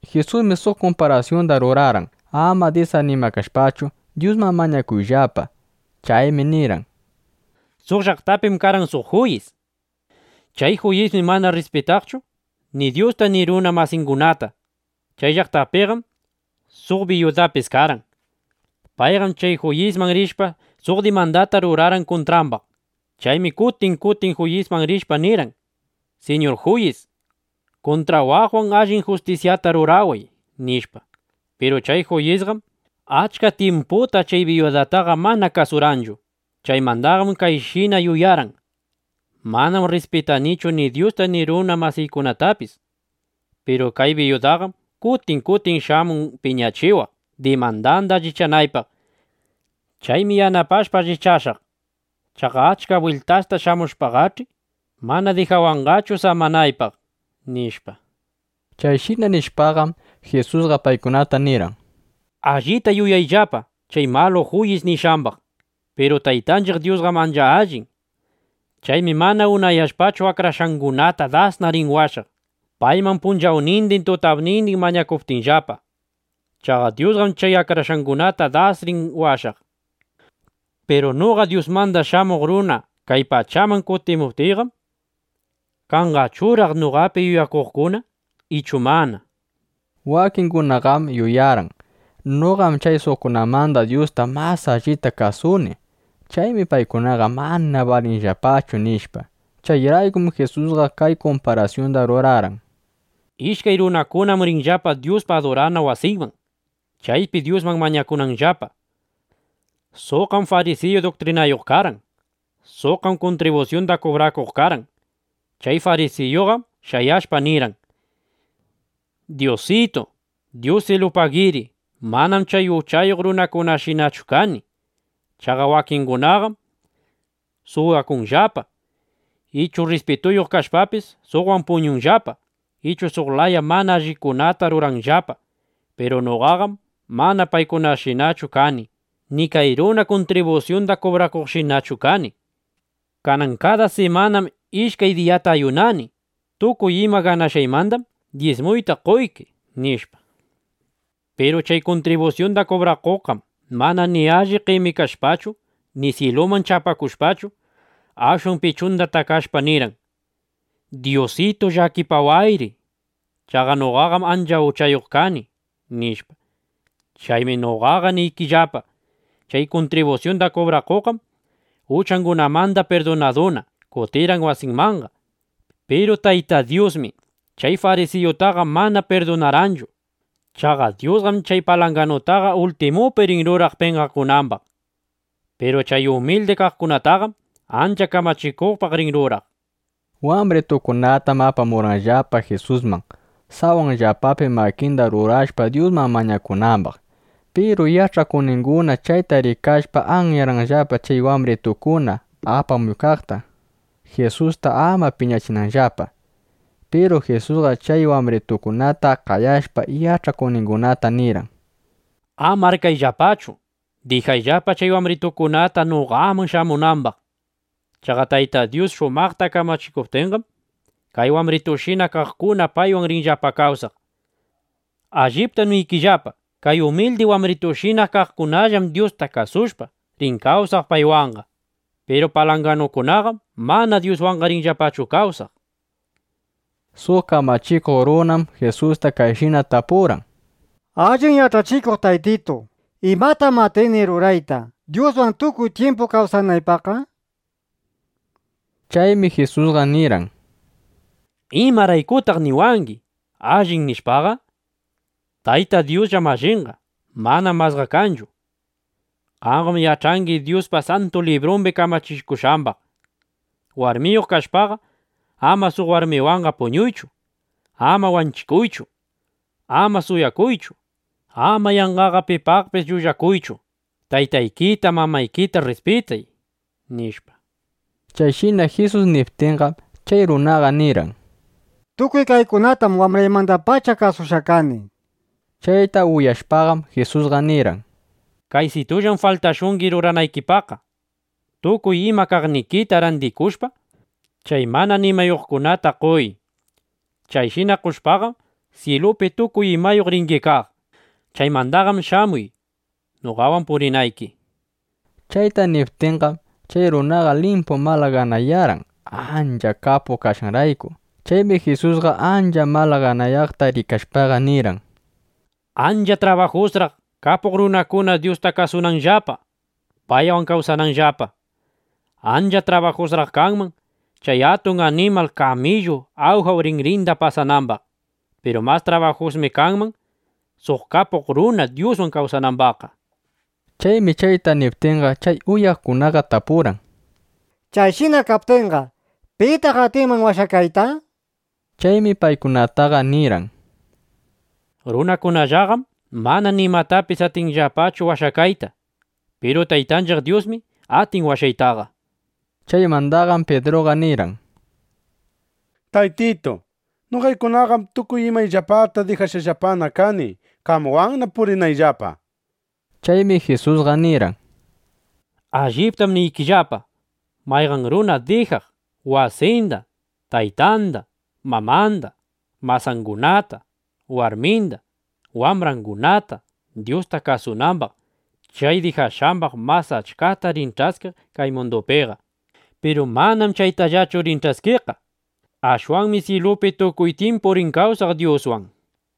Jisusmi suq kumparasyunda rurarqan, ama disanimakashpachu, Dyusman mañakunanllapa. Chaymi nirqan: —Suq llaqtapim karqan suq juyis. Chay juyismi mana rrispitaqchu ni Dyusta ni runa masingunata. Chay llaqtapiqam suq biyudapis karqan. Payqam chay juyisman rishpa, suq dimandata rurarqan kuntrambaq. Chaymi kutin kutin juyisman rishpa nirqan: “Siñur juyis, kuntrawaqwan allin justisyata ruraway”, nishpa. Piru chay juyisqam achka tyimputa chay biyudataqa mana kasurqanchu. Chaymandaqam kayshina yuyarqan: “Manam rrispitanichu ni Dyusta ni runa masiykunatapis. Piru kay biyudaqam kutin kutin shamun piñachiwaq, dimandanda allichanaypaq. Chaymi yanapashpa allichashaq. Chaqa achka bwiltasta shamushpaqach'i, mana dijawanqachu samanaypaq”, nishpa. Chayshina nishpaqam, Jisusqa paykunata nirqan: —Allita yuyayllapa chay malu juyis nishqambaq. Piru Taytanchiq Dyusqam ancha allin. Chaymi mana unayashpachu, akrashqangunata dasna rin washaq, payman punchawnindin, tutapnindin mañakuptinllapa. Chaqa Dyusqam chay akrashqangunata das rin washaq. Piru noqa Dyusmanda Shamuq Runa kay pachaman kutimuptiyqam, ¿kanqachuraq noqapi yuyakuqkuna ichu mana? nishpa. Wakingunaqam yuyarqan: Noqam chay suqkunamanda Dyusta mas allita kasuni. Chaymi paykunaqa mana balinllapachu, nishpa. Chayraykum Jisusqa kay kumparasyunda rurarqan: —Ishkay runakunam rirqanllapa Dyuspa adurana wasinman, chaypi Dyusman mañakunanllapa. Suqqam farisiyu duktrinayuq karqan. Suqqam kuntribusyunda kubrakuq karqan. Chay farisiyuqam shayashpa, nirqan: “Dyusitu, dyusilupagiri; manam chay uchayuq runakunashinachu kani. Chaqa wakingunaqam suwakunllapa, ichu rrispituyuq kashpapis, suqwan puñunllapa, ichu suq laya mana allikunata ruranllapa. Piru noqaqam mana paykunashinachu kani, ni kay runa kuntribusyunda kubrakuqshinachu kani. Kanan kada simanam ishkay diyata ayunani. Tukuy ima ganashqaymandam dyismuyta qoyki”, nishpa. ’Piru chay kuntribusyunda kubrakuqqam mana ni alli qemikashpachu, ni syiluman chapakushpachu, ashwan pichunda takashpa nirqan: “Dyusitu, llakipawayri. Chaqa noqaqam ancha uchayuq kani”, nishpa. ’Chaymi noqaqa niykillapa, chay kuntribusyunda kubrakuqqam uchangunamanda pirdunaduna, kutirqan wasinmanqa. Piru Tayta Dyusmi chay farisiyutaqa mana pirdunarqanchu. Chaqa Dyusqam chay palanganutaqa ultimupi rin ruraq penqakunambaq. Piru chay umildi kaqkunataqam ancha kamachikuqpaq rin ruraq. Wambritukunatam apamurqanllapa Jisusman, sawanllapapi makinda rurashpa, Dyusman mañakunambaq. Piru yach'akuqninguna chayta rikashpa, anyarqanllapa chay wambritukuna apamuqkunata (Jisusta ama piñachinanllapa). Piru Jisusqa chay wambritukunata qayashpa, yach'akuqningunata nirqan: —Ama arkayllapachu. Dijayllapa chay wambritukunata, noqaman shamunambaq. Chaqa Tayta Dyus shumaqta kamachikuptinqam, kay wambritushina kaqkuna paywan rinllapa kawsaq. Alliptam niykillapa, kay umildi wambritushina kaqkunallam Dyusta kasushpa, rin kawsaq paywanqa. Piru palanganukunaqam mana Dyuswan rinllapachu kawsaq. Suq kamachikuq runam Jisusta kayshina tapurqan: —Allin yach'achikuq Taytitu, ¿imatam atini rurayta, Dyuswan tukuy tyimpu kawsanaypaqqa? nishpa. Chaymi Jisusqa nirqan: —¿Imaraykutaq niwangi: “Allin” nishpaqa? Tayta Dyusllam allinqa. Manam masqa kanchu. Qamqam yach'angi Dyuspa Santu Librumbi kamachikushqambaq: “Warmiyuq kashpaqa, ama suq warmiwanqa puñuychu. Ama wanchikuychu. Ama suwakuychu. Ama yanqaqa pipaqpis llullakuychu. Taytaykita, mamaykita rrispitay”, nishpa. Chayshina Jisus niptinqam, chay runaqa nirqan: —Tukuy kaykunatam wambraymandapacha kasushqa kani, nishpa. Chayta uyashpaqam, Jisusqa nirqan: —Kaysitullam faltashungi ruranaykipaqqa. Tukuy ima kaqnikita randikushpa, chay mana nimayuqkunata qoy. Chayshina qoshpaqam, syilupi tukuy imayuq ringi kaq. Chaymandaqam shamuy, noqawan purinayki, nishpa. Chayta niptinqam, chay runaqa limpu malaganayarqan, ancha kapuq kashqanrayku. Chaymi Jisusqa, ancha malaganayaqta rikashpaqa nirqan: —Ancha trabajusraq, kapuq runakuna Dyusta kasunanllapa, paywan kawsananllapa. Ancha trabajusraq kanman, chay atun animal kamillu awjap rinrinda pasanambaq. Piru mas trabajusmi kanman, suq kapuq runa Dyuswan kawsanambaqqa, nishpa. Chaymi chayta niptinqa, chay uyaqkunaqa tapurqan: —Chayshina kaptinqa, ¿pitaq atinman washakayta? nishpa. Chaymi paykunataqa nirqan: —Runakunallaqam mana nimatapis atinmanllapachu washakayta. Piru Taytanchiq Dyusmi atin washaytaqa, nishpa. Chaymandaqam Pidruqa nirqan: —Taytitu, noqaykunaqam tukuy imayllapata dijashqallapana kani, qamwanna purinaypaqllapa, nishpa. Chaymi Jisusqa nirqan: —Alliptam niykillapa, mayqan runa dijaq wasinda, taytanda, mamanda, masangunata, warminda, wambrangunata, Dyusta kasunambaq, chay dijashqambaq mas achkata rin ch'askiq kay mundupiqa. Piru manam chaytallachu rin ch'askiqqa. Ashwanmi syilupi tukuy tyimpu rin kawsaq Dyuswan, nishpa.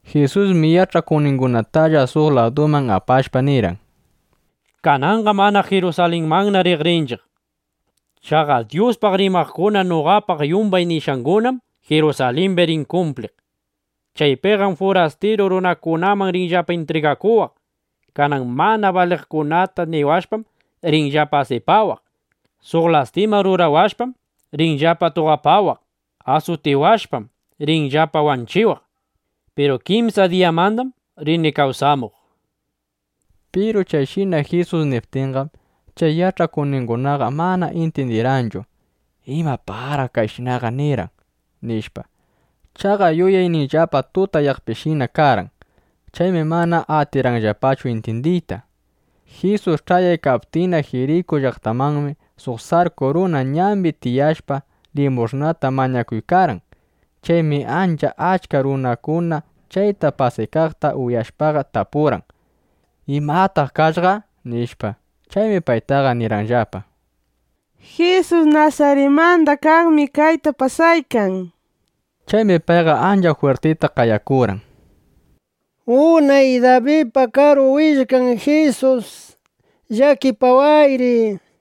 Jisusmi yach'akuqningunatalla suq laduman apashpa, nirqan: —Kananqam anaq Jirusalinmanna rinchiq riq. Chaqa Dyuspaq rimaqkuna noqapaq yumbay nishqangunaqam Jirusalimbi rin kumpliq. Chaypiqam furastiru runakunamanna rinllapa intrigakuwaq. Kanan mana baliqkunata niwashpam, rinllapa asipawaq. Suq lastima rurawashpam, rinllapa tuqapawaq. Asutiwashpam, rinllapa wanchiwaq. Piru kimsa diyamandam rini kawsamuq, nishpa. Piru chayshina Jisus niptinqam, chay yach'akuqningunaqa mana intyindirqanchu: ¿Imapaqraq chayshinaqa nirqan? nishpa. Chaqa yuyayninllapa tutayaqpishina karqan. Chaymi mana atirqanllapachu intyindiyta. Jisus ch'ayaykaptinna Jiriku llaqtamanmi, suq sarku runa ñambi tiyashpa, limush'nata mañakuykarqan. Chaymi ancha achka runakuna chayta pasaykaqta uyashpaqa, tapurqan: —¿Imataq kashqa? nishpa. Chaymi paytaqa nirqanllapa: —Jisus Nasaritmanda kaqmi kayta pasaykan, nishpa. Chaymi payqa ancha jwirtita qayakurqan: —¡Unay Dabidpa Karu Willkan Jisus, llakipawayri! nishpa.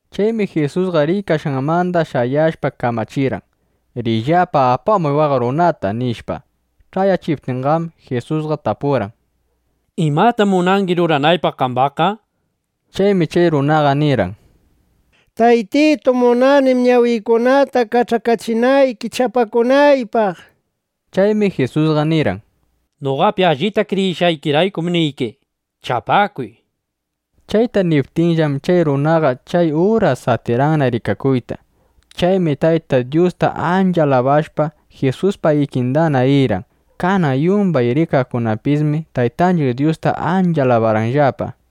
Chaymi Jisusqa riykashqanmanda shayashpa, kamachirqan: —Riyllapa apamuy waq runata, nishpa. Ch'ayachiptinqam, Jisusqa tapurqan: —¿Imatam munangi ruranaypaq qambaqqa? nishpa. Chaymi chay runaqa nirqan: —Taytitu, munanim ñawiykunata kach'akachinayki chapakunaypaq, nishpa. Chaymi Jisusqa nirqan: —Noqapi allita kriyishqaykiraykum niyki, chapakuy, nishpa. Chayta niptinllam, chay runaqa chay uras atirqanna rikakuyta. Chaymi Tayta Dyusta ancha alabashpa, Jisuspa ikindana rirqan. Kanan yumbay rikaqkunapismi Taytanchiq Dyusta ancha alabarqanllapa.